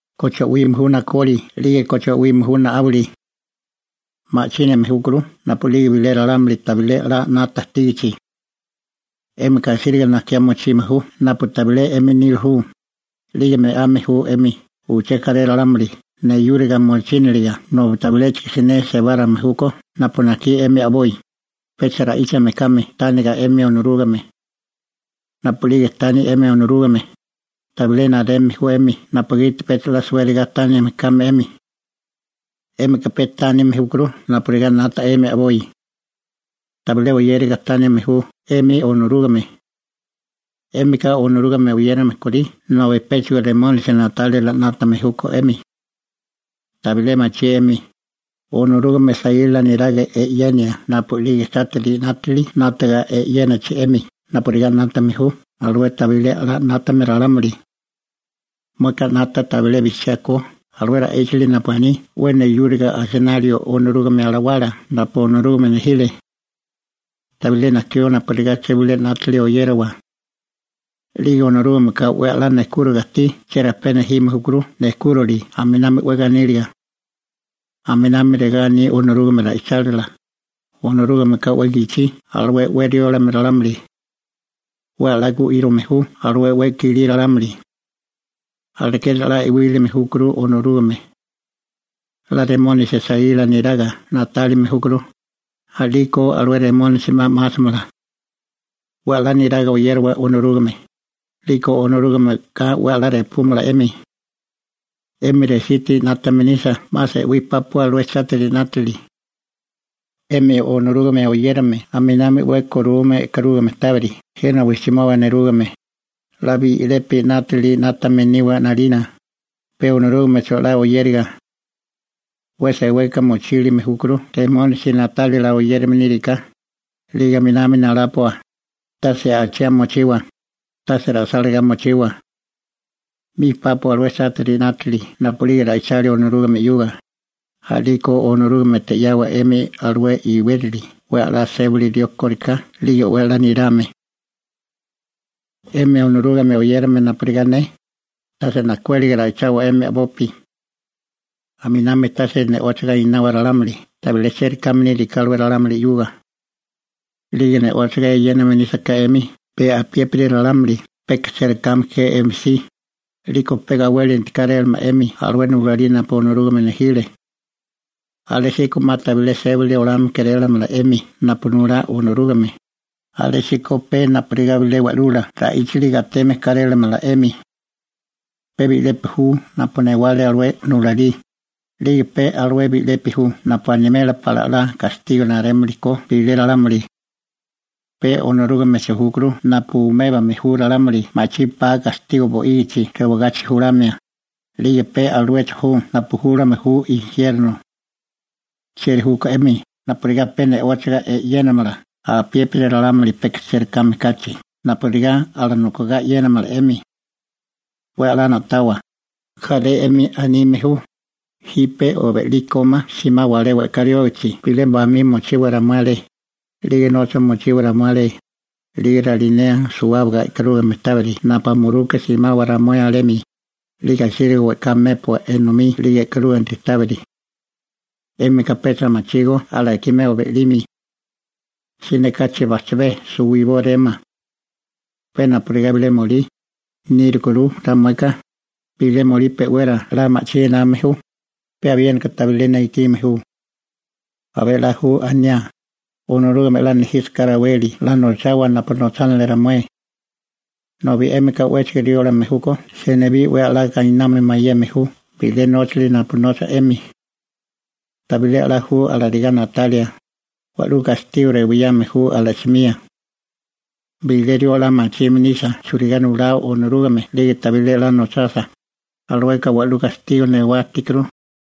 ¿Koche o'wime ju nakoli? 'Lige ¿Koche o'wime ju na'áwili? Ma'chíname júkuru napu'lige bilé ralámuli tabilé 'la 'nata ajtígichi. 'Émika asíriga najkiá mochime ju napu tabilé 'emi nila ju, 'lige me'ame ju 'emi uché jaré ralámuli neyúriga mochíniliga nobi tabiléchigo siné sebárame júkó napu najkí 'emi a'boi, pecha ra'íchame kame tániga 'emi Onorúgame. Napu'lige tani 'emi Onorúgame, tabilé nareme ju 'emi napugiti pecha 'la suériga tánime kame 'emi. 'Émika pe tánime júkuru napurigá 'nata 'emi a'boi. Tabilé oyériga tánime ju 'emi Onorúgame. 'Émika Onorúgame oyérame korí nobi péchigo Remónisi na'tálila 'nátame júkó 'emi. Tabilé machí 'emi, Onorúgame saíla neraga e'yenia napu'lige chátiri 'nátili 'nátaga e'yénachi 'emi napurigá 'nátame ju alué tabilé a'lá 'nátame ralámuli. ¿Mueka 'nata tabilé bijchiá ko Onorúgame ra'ichálila alué ra'íchali napu aní 'we neyúriga asinalio Onorúgame Alawala napu Onorúgame nejile? Tabilé najkió napurigá uché bilé 'nátili oyérawa. 'Lige Onorúgameka 'we 'la nejkúriga ajtí cherajpé nejime júkuru nejkúrali aminami 'we ganíliga. Aminami regá aní Onorúgame ra'ichálila: «Onorúgameka 'we gichí alué 'we riólame ralámuli. 'We 'la gu'írome ju alué 'we i'kilí ralámuli.» Alekeri 'la e'wílime júkuru Onorúgame. 'La Remónisi saíla neraga na'tálime júkuru, a'liko alué Remónisi 'ma 'másamala. 'We 'la niraga oyérowa Onorúgame, 'liko Onorúgameka 'we 'la repúmala 'emi. 'Emi resítiri 'nátame nisa 'ma se'wí pápua alué chátiri 'nátili. 'Emi Onorúgame oyérame aminami 'we korume e'karúgame tábiri jena wijchimoba nerúgame, 'la bi'lepi 'nátili 'nátame niwa 'nalina, pe Onorúgamecho 'la oyériga. 'We seweka mochílime júkuru Remónisi na'tálila oyérame níriká, 'lige aminami nalápua, tase achiá mochiwa, tase ra'sálagá mochiwa. 'Mi pápua alué chátiri 'nátili napu'lige ra'ichalia Onorúgame 'yuga, a'liko Onorúgamete 'yawa 'emi alué iwérali 'we 'la sébali rió kóriká 'lige 'we 'la nirame. 'Emi Onorúgame oyérame napurigá ne, tase najkuéliga ra'ichawa 'emi a'bopi. Aminami tase ne'óchiga einawa ralámuli tabilé chérikáme níriká alué ralámuli 'yuga. 'Lige ne'óchiga e'yéname nísaká 'emi pe apiépiri ralámuli peka chérikáme ke 'emi si, 'liko pe gawélinti kárélamala 'emi alué nulalí napu Onorúgame nejile. Alésíko 'ma tabilé sébali olame kérélamala 'emi napu nulá Onorúgame, alésíko pe napurigá bilé wa'lula ra'íchali gateme kárélamala 'emi. Pe bi'lepi ju napu newale alué nulalí, 'lige pe alué bi'lepi ju napu animela pala 'la gastigo narémili ko bilé ralámuli. Pe Onorúgamecho júkuru napu umébame ju ralámuli ma'chí pa gastigo bo'ígichi rewagachi julamia, 'lige pe aluecho ju napu júlame ju injierno. ¿Chieri júkó 'emi napurigá pe ne'óchiga e'yénamala apiépiri ralámuli peka chérikáme kachi napurigá alanokigá e'yénamala 'emi? 'We 'la na'tawa, jaré 'emi anime ju: «Jipe o be'lí kómá simawa alé we'ká riógachi bilé bamí mochiwa ramué alé, 'lige nocha mochiwa ramué alé, 'lige ralinea suwábaga e'karúgame tábiri napu muruka simawa ramué alemi, 'lige asíriga we'ká mépua enomí 'lige e'karúginti tábiri.» 'Émika pecha machígó alakimeo be'limi. Siné kachi bajchabé suwibóréma. Pe napurigá bilé molí nírukuru ramueka, bilé molí pe'wera 'la ma'chí ename ju, pe abiéniko tabilé ne ikime ju. Abé 'la ju aniá: «Onorúgame 'la nejísaká raweli 'la nochawa napu nochánili ramué.» Nobi 'émika 'wéchigo riólame júkó senibí 'we 'la gainamio mayeme ju bilé nóchali napu nocha 'emi. Tabilé 'la ju alarigá na'talia, wa'lú gastigo rewiyame ju ala'simía. Bilé rió 'la machime nisa churigá nulao Onorúgame 'lige tabilé 'la nochasa, alueka wa'lú gastigo rewá ajtíkuru.